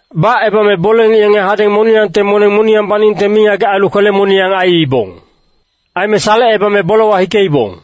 Bacebame bole-ngic yenge hadeng moniyangte moneng moniyang baningte mingagec ailu kwele-moniyang aiibong. Aime salecebame bolewa hikeibong.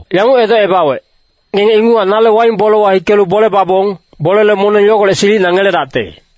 yanguc edocebawec, ‘Ngenge inguchac nale waing bolewa hikelu bole babong, bolele moneng yogolec silicina ngeledacte.’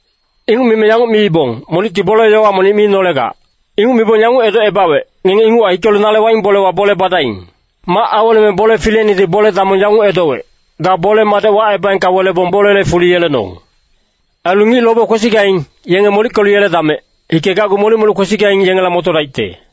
“Inguc mime yanguc miibong, ‘Monicti bole-yowa monic mi nolegac.’ “Inguc mibong yanguc edocebawec, ‘Ngenge inguchac hikelu nale waing bolewa bole badaing.’ “Mac aweleme bole fileinedi bole-damong yanguc edowec, ‘Ga bole-madec wacebaengka welebong bolele fuli yelenong. Ailu ngic lobe kwesigaing, yenge molickelu yeledamec, hikegacgu molic-molic kwesigaing yengela motodaicte.’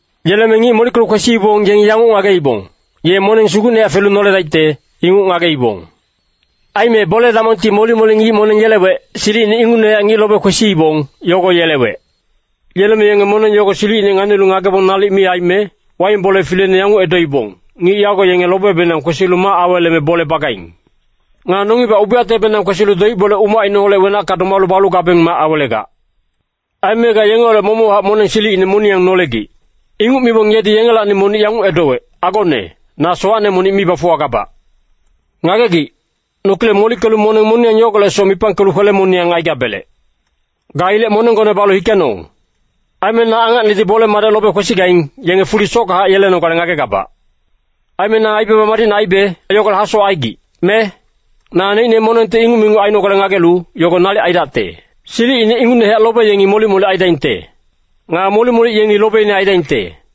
Yeleme ngic molickelu kwesiibong yengi yanguc ngageibong, ‘Ye moneng sugucnehac felu noledaicte,’ inguc ngageibong. Aime bole-damongti molic-molic ngic moneng yelewec, silicine ingucnehac ngic lobe kwesiibong, yogo yelewec. Yeleme yenge moneng yogo silicine nganilu ngagebong nalic mi aime, waing bole fileine yanguc edoibong, ‘Ngic yago yenge lobebenang kwesilu mac aweleme bole bagaing. Nga nongibac ubiyactebenang kwesilu doic-bole umacineholec wenacka domalu balu gabeng mac awelegac. Aime ga yengeholec momochac moneng silicine moniyang nolegic.’ “Inguc mibong yedi yengelacni monic yanguc edowec, ‘Agone, na sowacne monic mi bafuwagabac. Ngagegic, nokilec molickelu moneng moniyang yogolecsoc mipangkelu kwele-moniyang aigabelec. Ga ilec monenggone balu hikenong. Aime na angacnedi bole-madec lobe kwesigaing, yenge fuli sockahac yelenogale ngagegabac. Aime na aibaba madicne aibe, yogolec hasowac aigic, me? Naneicne monengti inguc me inguc ainogale ngagelu, yogo nalic aidacte.’ “Silicine ingucnehac lobe yengi molic-molic aidaingte. Nga molic-molic yengi lobeine aidaingte.”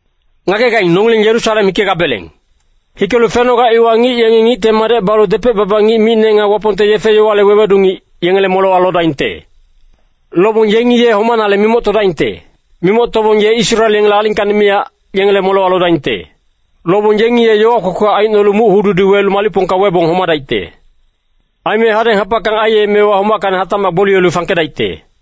“Ngagegaing, nongileng Yerusalem hikegabeleng. Hikelu fenoga iwa ngic yengi Ngicte Madec balu depec-baba ngic micne nga Wapongte yefe-yowale wewedu ngic, yengele molewa lodaingte. Lobong yengi ye homanale mimoctodaingte. Mimoctobong ye Israel yengele alingkacni miyac, yengele molewa lodaingte. Lobong yengi ye yowa kwekwe aicnolu muc-hududi welu malicpongka webong homadaicte. Aime hadeng habackang aiyemewa homackacni hatacmac gboliyelu fangkedaicte.”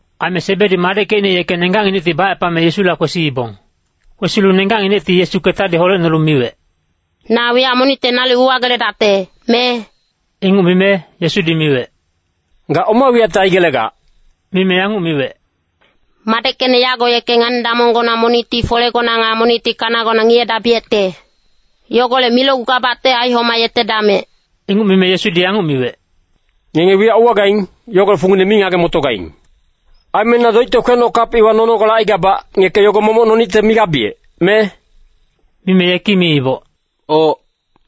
Aime Sebedi madeckecine yeke nenggacnginecti bacepame Yesula kwesiibong. Kwesilu nenggacnginecti Yesu ketadi holecnolu miwec, “Na wiyac monicte nalic uwageledacte, me?” Inguc mime, Yesudi miwec, “Ga oma wiyacte aigelegac?” Mime yanguc miwec, “Madeckecne yago yeke ngani-damonggona monicti folegona nga monicti kanagona ngiyedabiyecte. Yogolec milocgugabacte aihomayetedamec.” Inguc mime Yesudi yanguc miwec, “Ngenge wiyac uwagaing, yogolec fungine mi ngage-motogaing. Aime na doicte kwenoc kap iwa nonogale aigabac, ngeke yogo momoc nonicte migabiyec, me?” Mime yeki miiboc, “Oc,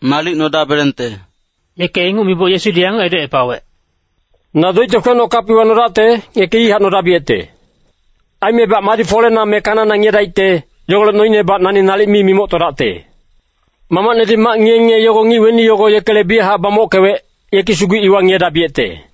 nalic nodabelecte.” Yeke inguc miboc Yesudi yanguc edocepawec, “Na doicte kwenoc kap iwa nodacte, ngeke ihac nodabiyecte. Aimebac madi folena me kanana ngiyedaicte, yogolec noinebac nani nalic mi mimoctodacte. Mamacnedi mac ngiye-ngiye yogo ngic weni yogo yekele biyachac bamockewec, yeki sugu iwa ngiyedabiyecte.”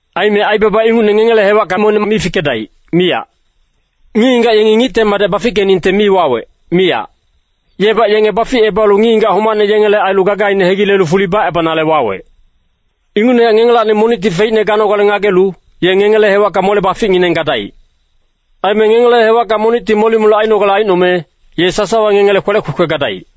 Aime aibaba ingucne ngengele hewacka monic mi fikedaic, miyac. Ngic-ngigac yengi Ngicte Madec bafickeningte mi wawec, miyac. Yebac yenge baficebalu ngic-ngigac homacne yengele ailu gagaine hegilelu fuli bacebanale wawec. Ingucnehac ngengelacni monicti feicne ganogale ngagelu, ye ngengele hewacka mole-baficngineng gadaic. Aime ngengele hewackacni monicti molic-molic ainogale aicnome, ye sasawa ngengele kwelec kwekwe gadaic.”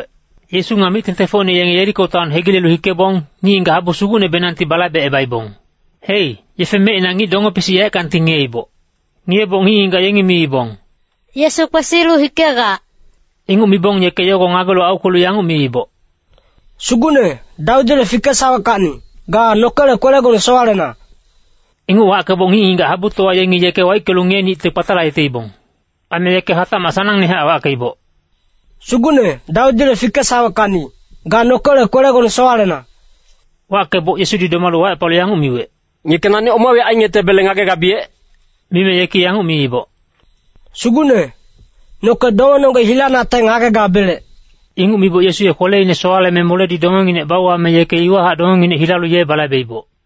Yesu nga mic-tengtengfocine yenge Yeriko taon hegilelu hikebong, ngic-ngigac habu sugucnebenangti balaibecebaibong. Hei, yefe mecina ngic donge-pisic yaeckangti ngiyeiboc. Ngiyeboc ngic-ngigac yengi miibong, “Yesu kwesilu hikegac.” Inguc mibong yeke yogo ngagelu aukwelu yanguc miiboc, “Sugucne, Dawidile fikesaweckacni, ga nokele kwelegone sowalena.” Inguc wackeboc ngic-ngigac habutowa yengi yeke waickelu ngiyenicte kpatalayeteibong. Aime yeke hatacmac sanangnehac wackeiboc, “Sugucne, Dawidile fikesaweckacni, ga nokele kwelegone sowalena.” Wackeboc Yesudi domalu wacepalu yanguc miwec, “Ngeke nani oma wiyac aingetebele ngagegabiyec?” Mime yeki yanguc miiboc, “Sugucne, noke dongenonggec hilanacte ngagegabelec.” Inguc miboc Yesu ye kweleine sowaleme moledi dongenginec bauwame yeke iwahac dongenginec hilalu ye balaibeiboc.